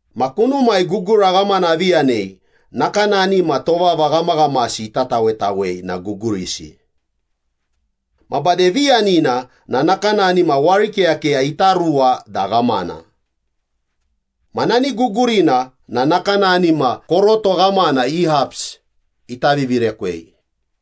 Ma kunumai gugura ghamana avi yanei nakanani ma tovava ghamaghamasi ita tawetawei na gugurisi. Ma bade viyanina na nakanani ma warikeyakeya ita ruwa da ghamana. Ma nani gugurina na nakanani ma koroto ghamana i haps ita vivirekwei.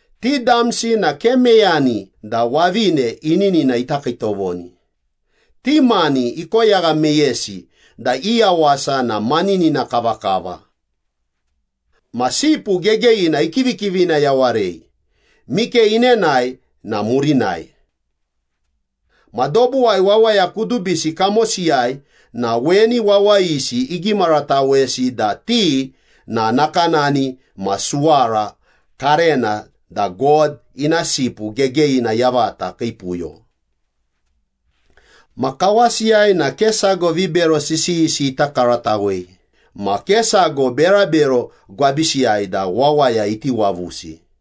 Ti damsi na ke meyani da wavine ininina ita kiitovoni, ti mani ikoyagha meyesi da i yawasa na maninina kavakava. Ma Sipu Gegeyina ikivikivina yawarei, mike inenae na murinai. Ma dobuwai wawaya kudubisi kamosiyai na weni wawayisi igimaratawesi da ti na nakanani ma suwara karena da God ina Sipu Gegeyina yavata kii puyo. Ma kawasiyai na ke sago vibero sisiyisi ita karatawei ma ke sago berabero gwabisiyai da wawaya iti wavusi.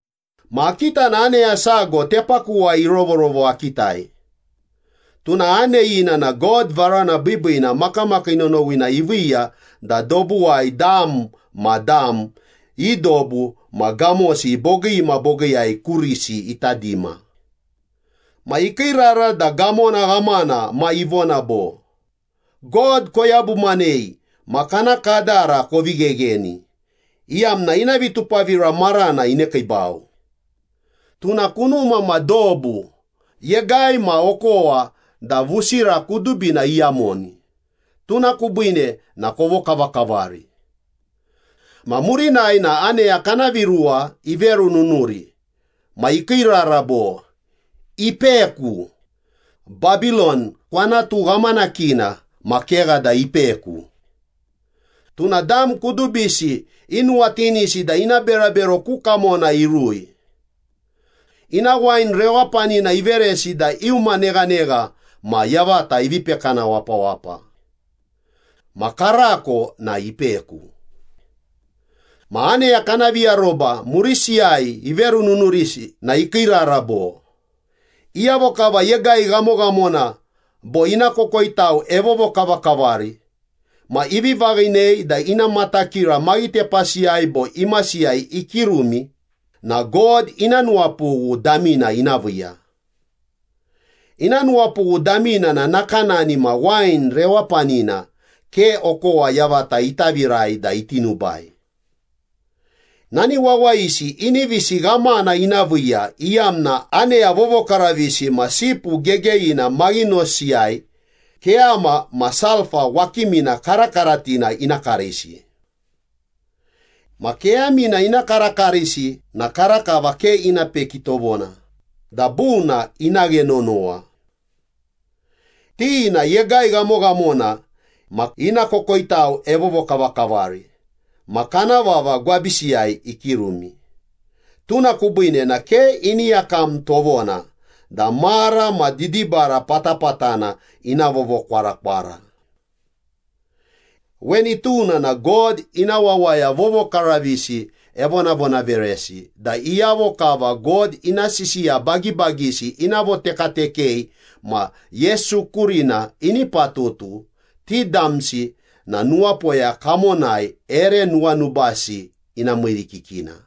Ma akita na aneya sago tepakuwai irovorovo akitai. Tuna aneyina na God varana biibiina makamakii nonowina iviiya da dobuwai dam ma dam, i dobu ma gamosi bogii ma bogiiyai kurisi ita dima. Ma ikiirara da gamona ghamana ma ivona bo, “God koyabumanei ma kana kadara kovi ghegheni, iyamna ina vitupavira marana inekiibau. Tuna kunuma ma dobu, yegai ma okowa da vusira kudubina iyamoni, tuna kubiine na kovokavakavari.” Ma murinai na aneya kana viruwa iverununuri ma ikiirara bo, “Ipeku. Babilon, kwanatu ghamanakina ma kegha da ipeku. Tuna dam kudubisi inuwatinisi da ina berabero ku kamona irui. Ina wain rewapanina iveresi da iuma neghanegha ma yavata ivi pekana wapawapa. Ma karako na ipeku.” Ma aneya kana viaroba murisiyai iverununurisi na ikiirara bo, “Iyavo kava yegai ghamoghamona bo ina kokoitau evovokavakavari ma ivi vaghinei da ina matakira maghitepasiyai bo imasiyai ikirumi na God ina nuwapughu damina ina viiya. Ina nuwapughu damina na nakanani ma wain rewapanina, ke okowa yavata ita virai da iti nubai. Nani wawayisi inivisi ghamana ina viiya iyamna aneya vovokaravisi ma Sipu Gegeyina maghinosiyai keyama ma sulpa wakimina karakaratina ina karisi. Ma keyamina ina karakarisi na karakava ke ina peki tovona da buna ina ghe nonowa. Ti na yegai ghamoghamona ma ina kokoitau evovokavakavari ma kana vava gwabisiyai ikirumi, tuna kubiine na ke ini yakam tovona da mara ma didibara patapatana ina vovokwarakwara.” Weni tuna na God ina wawaya vovokaravisi evonavonaveresi da iyavo kava God ina sisiya bagibagisi ina votekatekei ma Yesu kurina ini patutu, ti damsi na nuwapoya kamonai ere nuwanubasi ina miirikikina.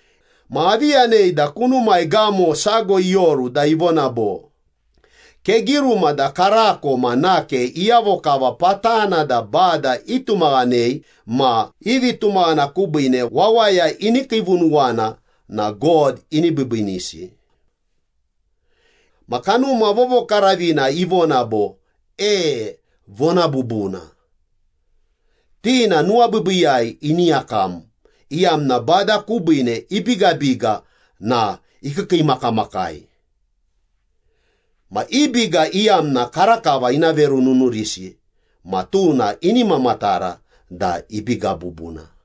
Ma avi yanei da kunumai gamo sago ioru da ivona bo, “Kegiruma da karako ma nake iyavo kava patana da Bada itumaghanei ma i vitumaghana kubiine wawaya ini kiivunuwana na God ini biibiinisi.” Ma Kanuma Vovokaravina ivona bo, “E, vona bubuna. Ti na nuwabiibiiyai ini yakam, iyamna Bada kubiine ibigabiga na ikiikiimakamakai. Ma i biga iyamna karakava ina verununurisi ma tuna ini mamatara da ibiga bubuna.”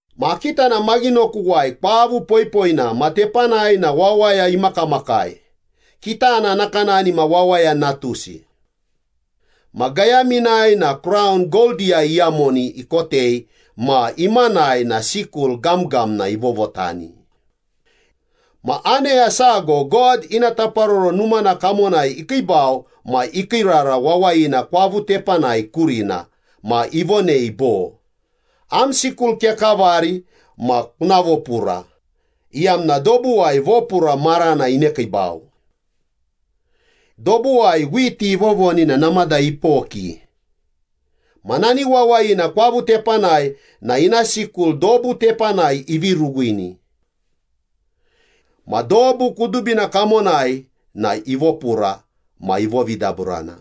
Ma akita na maghinokuwai kwavu poipoina ma tepanai na wawaya imakamakai, kitana nakanani ma Wawaya Natusi. Ma gayaminai na kraun goldiyai iyamoni ikotei ma imanai na sikul gamgamna ivovotani. Ma aneya sago God ina taparoro numana kamonai ikiibau ma ikiirara wawayina kwavu tepanai kurina ma ivonei bo, “Am sikul kekavari ma kuna vopura, iyamna dobuwai vopura marana inekiibau. Dobuwai whiti ivovoni na namada ipoki.” Ma nani wawayina kwavu tepanai na ina sikul dobu tepanai ivi ruwini. Ma dobu kudubina kamonai na ivopura ma ivovidaburana.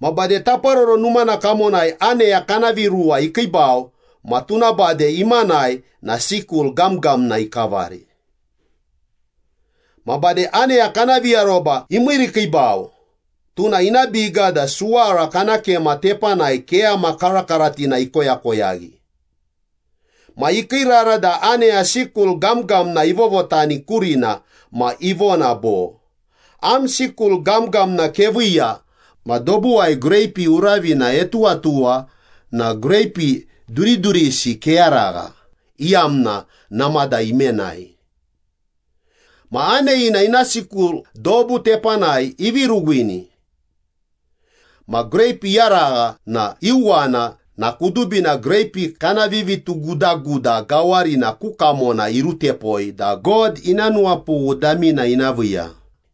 Ma bade Taparoro Numana kamonai aneya kana viruwa ikiibau ma tuna bade imanai na sikul gamgamna ikavari. Ma bade aneya kana viaroba imiirikiibau, tuna ina biga da suwara kana kema tepanai keyama karakaratina ikoyakoyaghi. Ma ikiirara da aneya sikul gamgamna ivovotani kurina ma ivona bo, “Am sikul gamgamna keviiya ma dobuwai greipi uravina etuwatuwa na greipi duridurisi keyaragha, iyamna namada imenai.” Ma aneyina ina sikul dobu tepanai ivi ruwini. Ma greipi iyaragha na iuwana na kudubina greipi kana vivitugudaguda gawarina ku kamona irutepoi da God ina nuwapughu damina ina viiya.